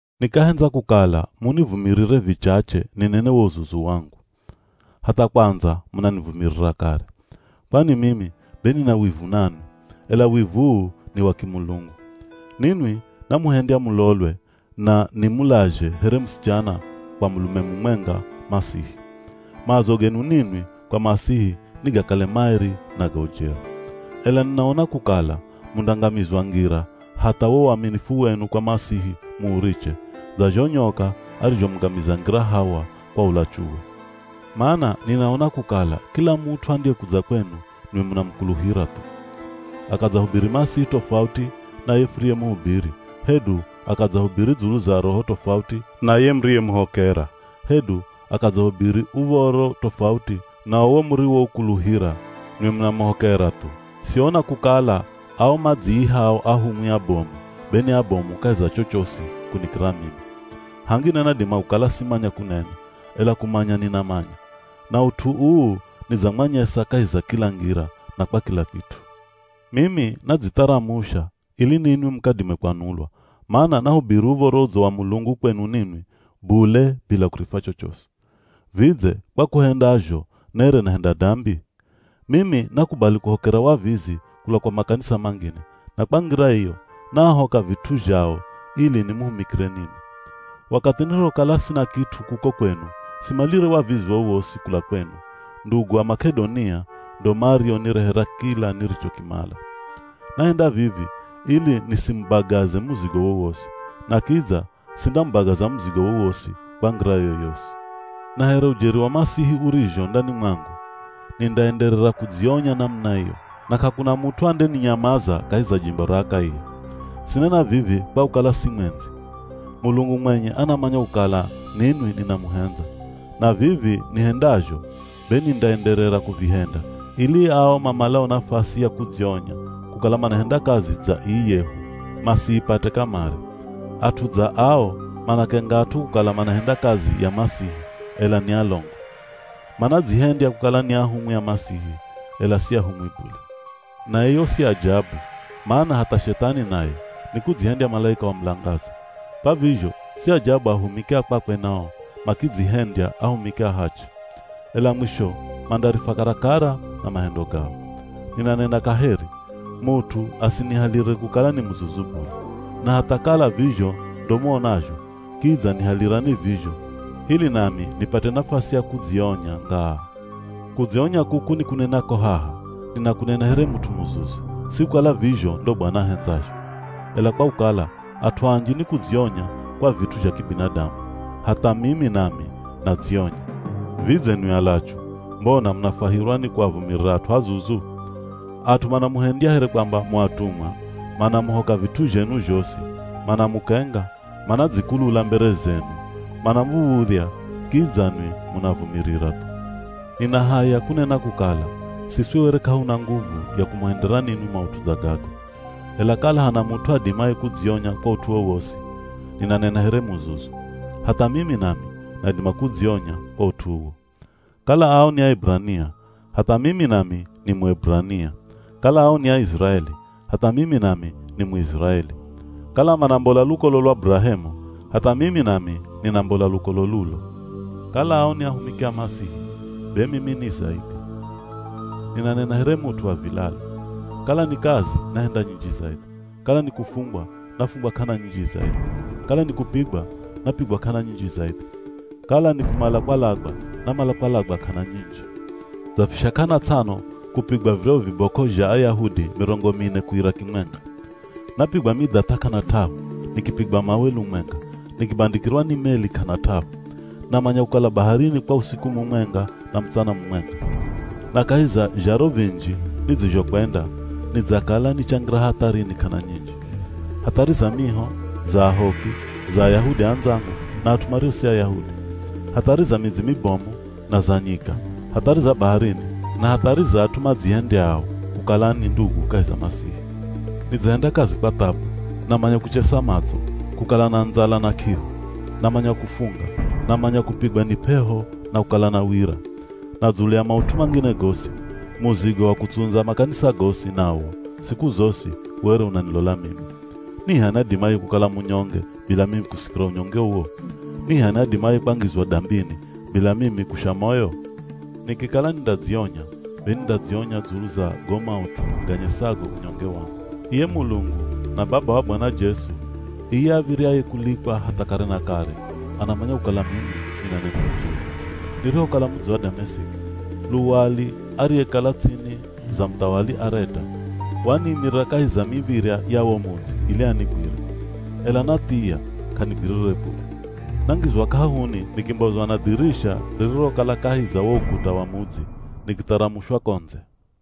Nikahendza kukala munivumirire vichache ninene wo uzuzu wangu. Hatha kwandza munanivumirira kare. Kwani mimi be nina wivu nanwi, ela wivu uu ni wa kimulungu. Ninwi namuhendya mulolwe, na nimulazhe here musichana kwa mulume mumwenga, Masihi. Maazo genu ninwi kwa Masihi nigakale maeri na ga ujeri. Ela ninaona kukala mundangamizwa ngira hatha wo uaminifu wenu kwa Masihi muuriche, dza zho nyoka arizhomungamiza ngira Hawa kwa ulachuwe. Mana ninaona kukala kila mut'u andiyekudza kwenu nwi munamukuluhira thu. Akadzahubiri Masihi tofauti na ye furiyemuhubiri, hedu akadzahubiri dzulu za Roho tofauti na ye muriyemuhokera, hedu akadzahubiri uv̱oro tofauti na uwo muriwoukuluhira, nwi munamuhokera thu! Siona kukala ao madziihao ahumwi abomu be ni abomu kahi za chochosi kunikira mimi. Hangine nadima kukala simanya kunena, ela kumanya ninamanya. Na ut'u uu nidzamwanyesa kahi za kila ngira na kwa kila kit'u. Mimi nadzitharamusha ili ninwi mukadime kwanulwa, mana nahubiri Uv̱oro Udzo wa Mulungu kwenu ninwi bule bila kurifwa chochosi. Vidze kwa kuhenda zho nere nahenda dambi? Mimi nakubali kuhokera wavizi kula kwa makanisa mangine, na kwa ngira iyo, naahoka vit'u zhao ili nimuhumikire ninwi. Wakathi nirihokala sina kit'u kuko kwenu, simalire wavizi wowosi kula kwenu, ndugu a Mak'edonia ndo marionirehera kila nirichokimala. Nahenda vivi ili nisimubagaze muzigo wowosi. Na kidza sindamubagaza muzigo wowosi kwa ngira yoyosi. Na here ujeri wa Masihi urizho ndani mwangu, nindaenderera kudzionya namuna iyo, na k'akuna mut'u andeninyamaza kahi za jimbo ra Akaia. Sinena vivi kwa kukala simwendzi! Mulungu mwenye anamanya kukala ninwi ninamuhendza. Na vivi nihendazho be nindaenderera kuvihenda ili ao mamalao nafasi ya kudzionya kukala manahenda kazi dza ii yehu masiipate kamare. At'u dza ao manakenga at'u kukala manahenda kazi ya Masihi ela ni alongo. Manadzihendya kukala ni ahumwi a Masihi, ela si ahumwi bule. Na iyo si ajabu, mana hatha Shethani naye nikudzihendya malaika wa mulangaza. Kwa vizho si ajabu ahumiki a kwakwe nao makidzihendya ahumiki a hachi. Ela mwisho mandarifwa karakara na mahendo gao. Ninanena kaheri. Mut'u asinihalire kukala ni muzuzu bule. Na hatha kala vizho ndo muonazho, kidza nihalirani vizho ili nami nipate nafasi ya kudzionya ngaa. Kudzionya kuku nikunenako haha, ninakunena here mut'u muzuzu, si kukala vizho ndo Bwana ahendzazho. Ela kwa kukala at'u anji nikudzionya kwa vit'u zha kibinadamu, hatha mimi nami nadzionya. Vidze nwi alachu, mbona munafwahirwa ni kuavumirira at'u azuzu? At'u manamuhendya here kwamba mu atumwa, manamuhoka vit'u zhenu zhosi, manamukenga, manadzikulula mbere zenu, manamuv̱udhya, kidza nwi munaavumirira thu. Nina haya kunena kukala, siswi were k'ahuna nguvu ya kumuhendera ninwi maut'u dza gago. Ela kala hana mut'u adimaye kudzionya kwa ut'u wowosi, (ninanena here muzuzu) hatha mimi nami nadima kudzionya kwa ut'u uwo. Kala ao ni Aeburania, hatha mimi nami ni Mueburania. Kala ao ni Aiziraeli, hatha mimi nami ni Muiziraeli. Kala manambola lukolo lwa Burahemu, hatha mimi nami ninambola lukolo lulo. Kala ao ni ahumiki a Masihi be mimi ni zaidhi. Ninanena here mut'u wa vilalu. Kala ni kazi nahenda nyinji zaidhi. Kala ni kufungwa, nafungwa k'ana nyinji zaidhi. Kala nikupigwa, napigwa k'ana nyinji zaidhi. Kala ni kumala kwalagwa, namala kwalagwa k'ana nyinji. Dzafisha k'ana ts'ano kupigwa viryahu vibok'o zha Ayahudi mirongo mine kuira kimwenga. Napigwa midhath'a k'ana t'ahu, nikipigwa mawe lumwenga, nikibandikirwa ni meli k'ana t'ahu. Namanya kukala baharini kwa usiku mumwenga na mutsana mumwenga. Na kahi za zharo vinji nidzizhokwenda, nidzakala nichangira hatharini k'ana nyinji. Hathari za miho, za ahoki, za Ayahudi andzangu na at'u mario si Ayahudi. Hathari za midzi mibomu na za nyika, hathari za baharini, na hathari za at'u madzihendyao kukala ni ndugu kahi za Masihi. Nidzahenda kazi kwa thabu, namanya kuchesa matso, kukala na ndzala na k'ihu, namanya kufunga, namanya kupigwa ni p'eho na kukala na wira. Na dzulu ya maut'u mangine gosi, muzigo wa kutsundza makanisa gosi, nawo siku zosi were unanilola mimi. Ni h'ani adimaye kukala munyonge bila mimi kusikira unyonge uwo? Ni h'ani adimaye kwangizwa dambini bila mimi kusha moyo? Nikikala nindadzionya, be nindadzionya dzulu za go maut'u ganyesago unyonge wangu. Iye Mulungu na Baba wa Bwana Jesu, iye av̱iryaye kulikwa hatha kare na kare, anamanya kukala mimi ninanena ujeri. Nirihokala mudzi wa Damesiki, luwali ariyekala ts'ini za muthawali Areta, waniimirira kahi za miv̱irya ya wo mudzi ili anigwire. Ela nathiya, k'anigwirire bule. Nangizwa k'ahuni, nikimbozwa na dhirisha ririrokala kahi za wo ukuta wa mudzi, nikitharamushwa ko ndze.